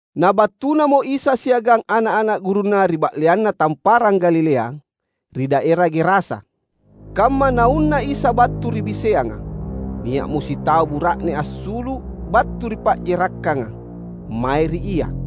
Na battunamo Isa siagang ana’-ana’ gurunNa ri ba’leanna Tamparang Galilea, ri daera Gerasa. Kamma Naunna Isa battu ri biseanga, nia’mo sitau bura’ne assulu’ battu ri pa’jerakkanga, mae ri Ia.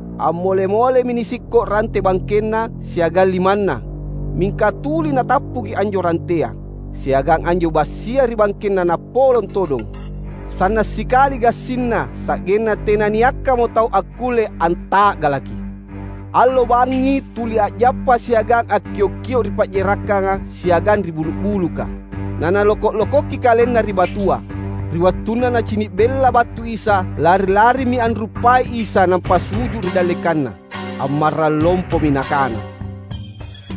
A’mole-molemi nisikko’ rante bangkenna siagang limanna, mingka tuli natappuki anjo rantea, siagang anjo bassia ri bangkenna napolong todong. Sanna’ sikali gassinna sa’genna tenanniakkamo tau akkulle anta’galaki. Allo bangngi tuli a’jappa siagang akkiok-kio’ ri pa’jerakkanga siagang ri bulu’-buluka, na naloko’-lokoki kalenna ri batua. Ri wattunna nacini’ bella battu Isa, lari-larimi anruppai Isa nampa su’ju’ ri dallekanNa. Ammarrang lompomi nakana,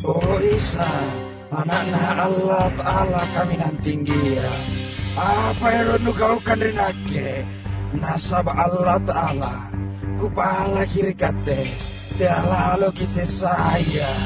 "O Isa, Ana’Na Allata’ala Kaminang Tinggia! Apa ero’ Nugaukang ri nakke? Nasaba’ Allata’ala, kupalaki ri Katte, tea’ laloKi’ sessaia’!"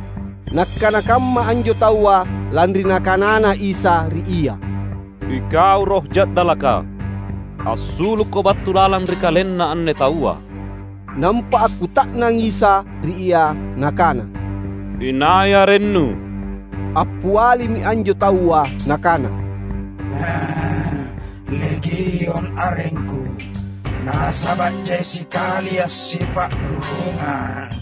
(Nakkana kamma anjo taua, lanri Nakanana Isa ri ia,"Ikau roh ja’dalaka, assulukko battu lalang ri kalenna anne taua!") Nampa akkuta’nang Isa ri ia Nakana, "Inai arennu?" Appialimi anjo taua nakana, "‘Legiun’ arengku — nasaba’ jai sikalia’ sipa’rurungang!"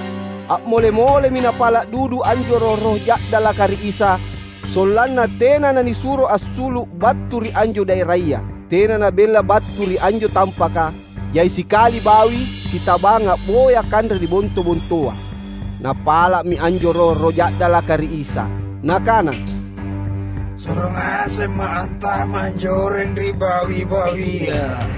A’mole-molemi napala’ dudu anjo roh-roh ja’dalaka ri Isa sollanna tena na nisuro assulu’ battu ri anjo daeraya. Tena nabella battu ri anjo tampaka, jai sikali bawi sitabang a’boya kanre ri bonto-bontoa. Napala’mi anjo roh-roh ja’dalaka ri Isa, nakana, "Suro ngasemma’ antama’ anjoreng ri bawi-bawia."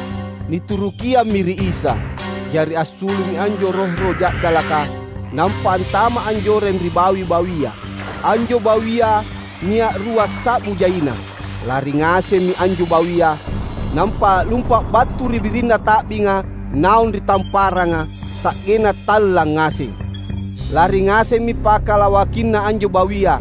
Niturukiammi ri Isa. Jari assulu’mi anjo roh-roh ja’dalaka, nampa antama’ anjoreng ri bawi-bawia. Anjo bawia nia’ ruassa’bu jaina. Lari ngasemmi anjo bawia, nampa a’lumpa’ battu ri birinna ta’binga naung ri tamparanga, sa’genna tallang ngaseng. Lari ngasemmi pakalawakinna anjo bawia,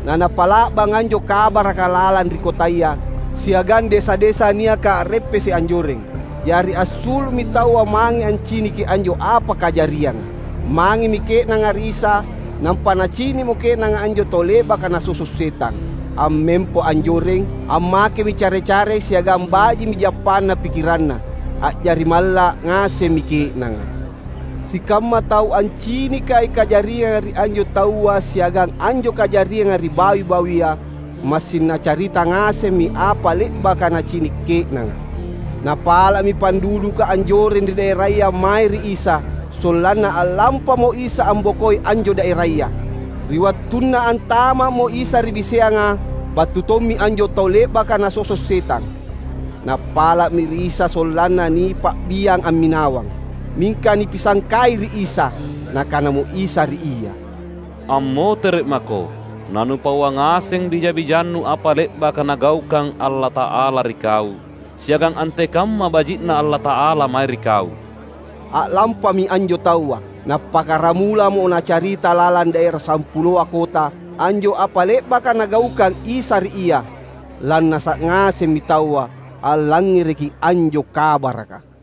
na napa’la’bang anjo kabaraka lalang ri kotaya siagang desa-desa niaka a’reppese’ anjoreng. Jari assulu’mi taua mange anciniki anjo apa kajarianga. Mangemi ke’nanga ri Isa, nampa nacini’mo ke’nanga anjo tau le’baka nasoso’ setang, ammempo anjoreng. Ammakemi care-care siagang baji’mi jappana pikkiranna. A’jari malla’ ngasemmi ke’nanga. Sikamma tau ancinikai kajarianga ri anjo taua siagang anjo kajarianga ri bawi-bawia, massing nacarita ngasemmi apa le’baka nacini’ ke’nanga. Napala’mi panduduka anjoreng ri daeraya mae ri Isa, sollanna a’lampamo Isa ambokoi anjo daeraya. Ri wattunna antama’mo Isa ri biseanga, battu tommi anjo tau le’baka nasoso’ setang. Napala’mi ri Isa sollanna nipa’biang amminawang. Mingka nipisangkai ri Isa. Nakanamo Isa ri ia, "Ammotere’ mako, na nupauang ngaseng bija-bijannu apa le’baka Nagaukang Allata’ala ri kau, siagang antekamma baji’na Allata’ala mae ri kau!" A’lampami anjo taua. Nappakkaramulamo nacarita lalang daera Sampuloa Kota, anjo apa le’baka Nagaukang Isa ri ia. Lannasa’ ngasemmi taua allangngereki anjo kabaraka.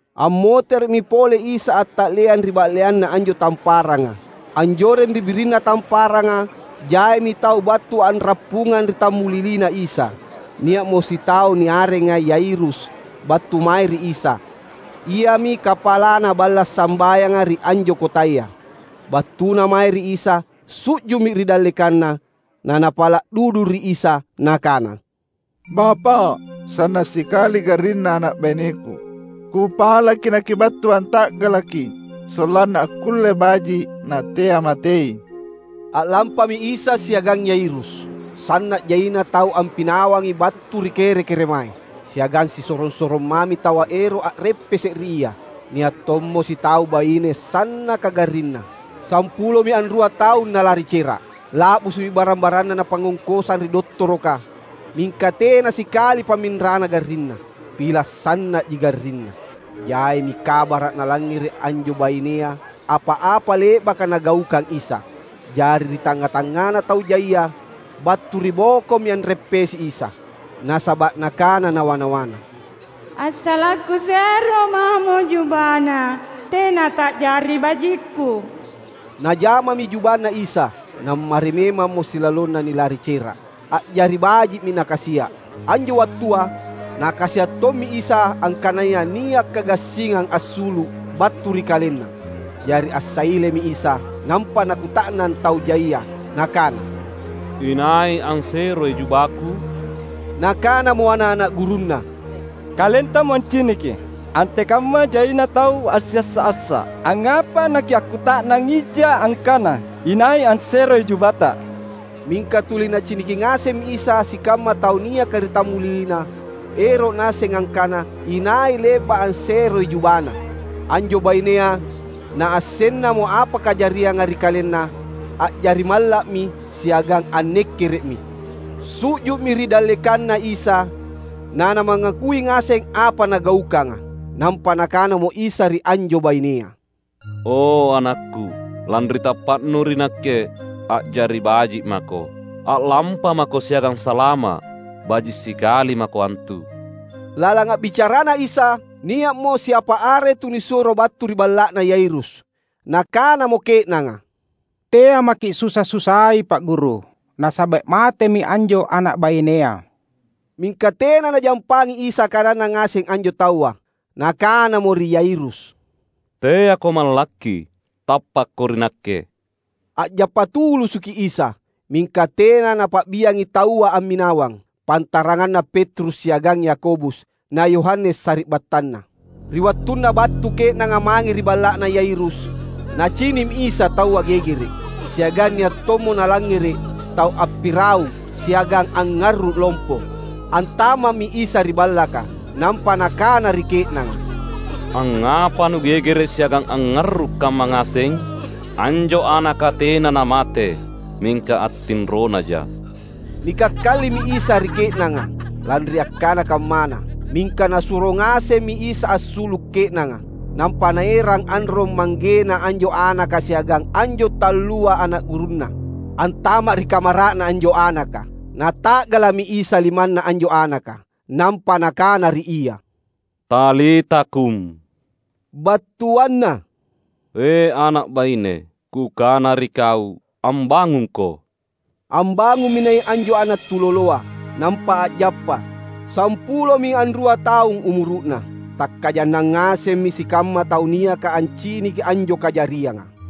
Ammotere’mi pole Isa anta’leang ri ba’leanna anjo tamparanga. Anjoreng ri birinna tamparanga jaimi tau battu a’rappungang ri tammuliliNa Isa. Nia’mo sitau, niareng Yairus, battu mae ri Isa. Iami kapalana balla’ sambayanga ri anjo kotaya. Battuna mae ri Isa, su’ju’mi ri dallekanNa. Na napala’ dudu ri Isa nakana, "Bapa’, sanna’ sikali garrinna ana’ baineku. Kupalaki naKibattu anta’galaki, sollanna akkulle baji’, natea matei!" A’lampami Isa siagang Yairus. Sanna’ jaina tau ampinawangi battu ri kere-keremae, siagang sisorong-sorong mami taua ero’ a’reppese’ ri Ia. Nia’ tommo sitau baine sannaka garrinna. Sampulomi anrua taung nalari cera’. La’busu’mi barang-baranna napangngongkosang ri dottoroka, mingka tena sikali pamminrana garrinna. Pila’ sanna’ji garrinna. Jaimi kabara’ nalangngere’ anjo bainea apa-apa le’baka Nagaukang Isa. Jari ri tangnga-tangngana tau jaia, battu ribokomi anreppesi Isa. Nasaba’ nakana nawa-nawana, "Assala’ kusero mamo jubaNa, tena ta’jari bajikku!" Najamami jubaNa Isa, nammari memammo silalonna nilari cera’. A’jari baji’mi Nakasia’. Anjo wattua nakasia’ tommi Isa angkanaya nia’ kagassingang assulu’ battu ri KalenNa. Jari assailemi Isa, nampa Nakuta’nang tau jaia, Nakana, "Inai anseroi jubaKu?" Nakanamo ana’-ana’ gurunNa, "KalenTamo anciniki, antekamma jaina tau assiassa’-assa’. Angngapa naKiakkuta’nang ija angkana inai anseroi jubaTa?" Mingka tuli Naciniki ngasemmi Isa sikamma tau niaka ri tammuliliNa ero’ Naasseng angkana inai le’ba’ anseroi jubaNa. Anjo bainea, naassennamo apa kajarianga ri kalenna, a’jari malla’mi siagang annekkere’mi. Su’ju’mi ri dallekanNa Isa na namangakui ngaseng apa nagaukanga. Nampa Nakanamo Isa ri anjo bainea, "O AnakKu, lanri tappa’nu ri Nakke, a’jari baji’ mako! A’lampamako siagang salama’. Baji’ sikali mako antu!" Lalang a’bicaraNa Isa, nia’mo siapa are tunisuro battu ri balla’na Yairus. Nakanamo ke’nanga, "Tea’ maki’ susa-susai Pa’ Guru. Nasaba’ matemi anjo ana’ bainea." Mingka tena Najampangi Isa kananna ngaseng anjo taua. Nakanamo ri Yairus, "Teako mallakki, tappakko ri Nakke!" A’jappa tulusuki Isa, mingka tena Napa’biangi taua amminawang, pantaranganna Petrus siagang Yakobus na Yohanes sari’battanna. Ri wattunna battu ke’nanga mange ri balla’na Yairus, Nacini’mi Isa taua gegere’, siagang nia’ tommo Nalangngere’ tau appiraung siagang angngarru’ lompo. Antama’mi Isa ri ballaka nampa Nakana ri ke’nanga, "Angngapa nugegere’ siagang angngarru’ kamma ngaseng? Anjo anaka tena namate, mingka attinronaja!" Nikakkalimi Isa ri ke’nanga, lanri akkana kammana. Mingka Nasuro ngasemmi Isa assulu’ ke’nanga. Nampa Naerang anrong-manggena anjo anaka siagang anjo tallua ana’ gurunNa antama’ ri kamara’na anjo anaka. Nata’gala’mi Isa limanna anjo anaka, nampa Nakana ri ia, "Talita kum," battuanna, "E ana’ baine, Kukana ri kau: ambangungko!" Ambangummi nai’ anjo ana’ tuloloa, nampa a’jappa. (Sampulomi anrua taung umuru’na.) Takkajannang ngasemmi sikamma tau niaka anciniki anjo kajarianga!